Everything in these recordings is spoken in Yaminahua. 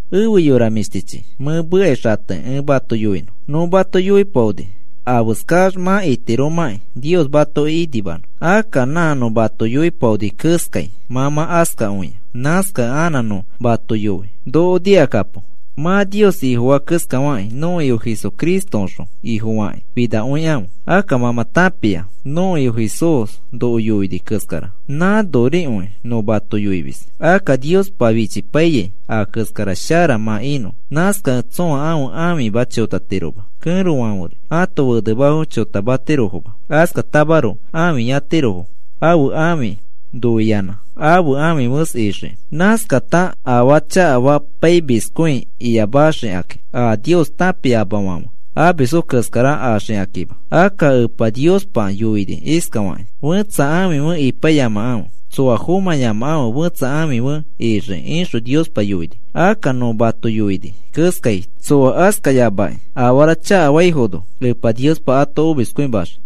Efe yora mĩshtichi, mẽ mekai xatekĩ ẽ mato yoinõ. Nõ mato yoipaoni afeskax mã itiromãkĩ Nios matoki inimanõ. Akka nã nõ mato yoipaoni keskai mã mã askakõia. Nãskakẽ anã nõ mato yoi noko nikakapo. Mã Nios Ifofaa keskafakĩ nõko Ifo Jesucristoõxõ Ifofakĩ finakõikãfe. Akka mã mã tãpia nõko Ifo Jesús noko yoini keskara, nãnorikõi nõ mato yoimis. Akka Niospa fichipai a keskara shara mã inõ. Nãskakẽ tsõa ãfe ãfima chotatiroma. Kẽrofãferi ãto fenemafo chotamatirofoma, Askatamaroko ãfiyatirofo ãfe ãfi noiyanã ãfe ãfifes ixiki. Nãskata afara chakafapaimiskõi iyamaxikakĩ, a Nios tãpiamafãfe amisfo keskara axikakima. Akka Epa Niospa yoini iskafakĩ: “Fẽtsa ãfi fe ipaiyamakãfe. Tsoa fomãyamakãfe fetsa ãfi fe ixiki,” ixõ Niospa yoini. Akka nõ mato yoini keskai, tsoa askayamakĩ afara chakafaifono Epa Niospa ato omiskõimaxii.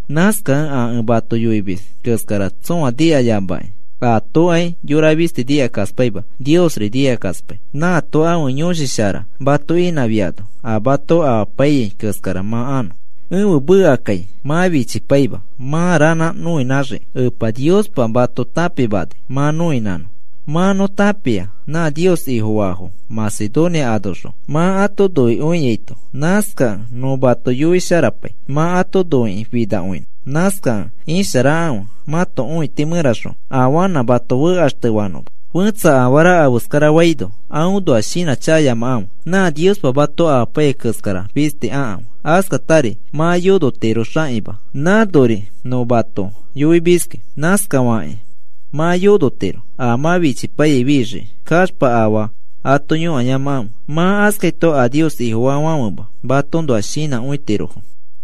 Nãskakẽ a ẽ mato yoimis keskara tsõa nikayamakĩ atokai yora fisti nikakaspaima. Niosri nikakaspai, nãato ãfe Yõshi Shara mato inãfiano a mato amapaiyai keskara mã anõ. Ẽfe mekakai mã fichipaima mã ranã noinãxiki. Epa Niospa mato tãpimani mã noinãnõ. Mã nõ tãpia nã Nios Ifofaafo Macedonia anoxõ mã ato noikõiaito. Nãskakẽ nõ mato yoisharapai, mã ato noiki finakõinõ. Nãskakẽ isharakãfe mãto õiti mẽraxõ afanã mato fekaxtefanõma. Fẽtsa afara afeskarafaino aõnoa shinãchakayamakãfe. Nã Niospa mato amapaiyai keskara fisti akãfe. Askatari mã yonotiro xanikima. Nãnori nõ mato yoimiski. Nãskafakĩ mã yonotiro a mã fichipaiyai fixiki. Kaxpa afaa ato yõkayamakãfe. Mã askaito a Nios Ifofaafãfema matoõnoa shinãkõitirofo.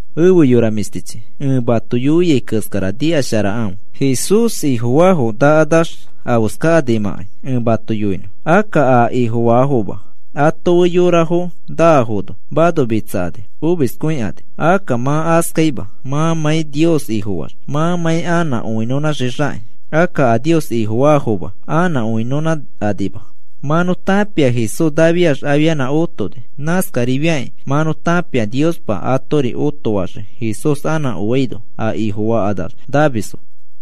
Efe yora mĩshtichi, ẽ mato yoiai keskara nikasharakãfe. Jesús Ifofaafo nakanax afeskakanimãkai ẽ mato yoinõ, akka a Ifofaafoma ato fe yorafo naafono, manomitsakani omiskõikani. Akka mã askaima mãmãi Nios Ifofaax, mãmãi anã õinõnãxixakĩ. Akka a Nios Ifofaafoma anã õinõnãkanima. Mã nõ tãpia Jesús nafiax afianã otoni. Nãskarifiakĩ mã nõ tãpia Niospa atori otofaxii. Jesús anã oaino, a Ifofakanax namisfo.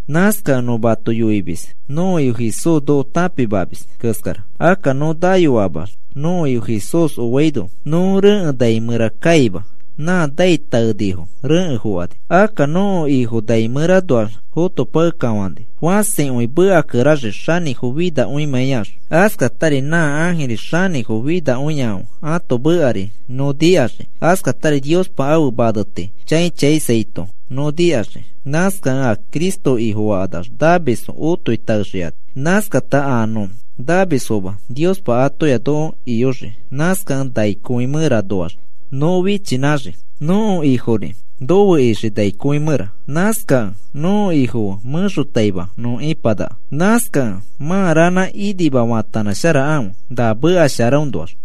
Nãskakẽ nõ mato yoimis nõko Ifo Jesús noko tãpimamis keskara. Akka nõ nayoamax nõko Ifo Jesús oaino nõ rekẽ nai mẽra kaima, nã naitaenifo rekẽ fokani. Akka nõko Ifo nai mẽranoax fotopakekafãni fãsikõi mekakeraxii xanĩfo finakõimãiax. Askatari nã ãjiri xanĩfo finakõiafãfe ãto mekari nõ nikaxii. Askatari Niospa ãfe maneti chãi chãisaito nõ nikaxii. Nãskakẽ a Cristo Ifofakanax namisfo otoi taexikani. Nãskata a nõ namisfoma Niospa atoya noko iyoxii, nãskakẽ nai kõi mẽranoax nõ fichinãxii. Nõko Ifori nofe ixii nai kõi mẽra. Nãskakẽ nõko Ifo fe mẽxotaima nõ ipanaka. Nãskakẽ mã ranã inima faatanãsharakãfe, na meka sharaõnoax.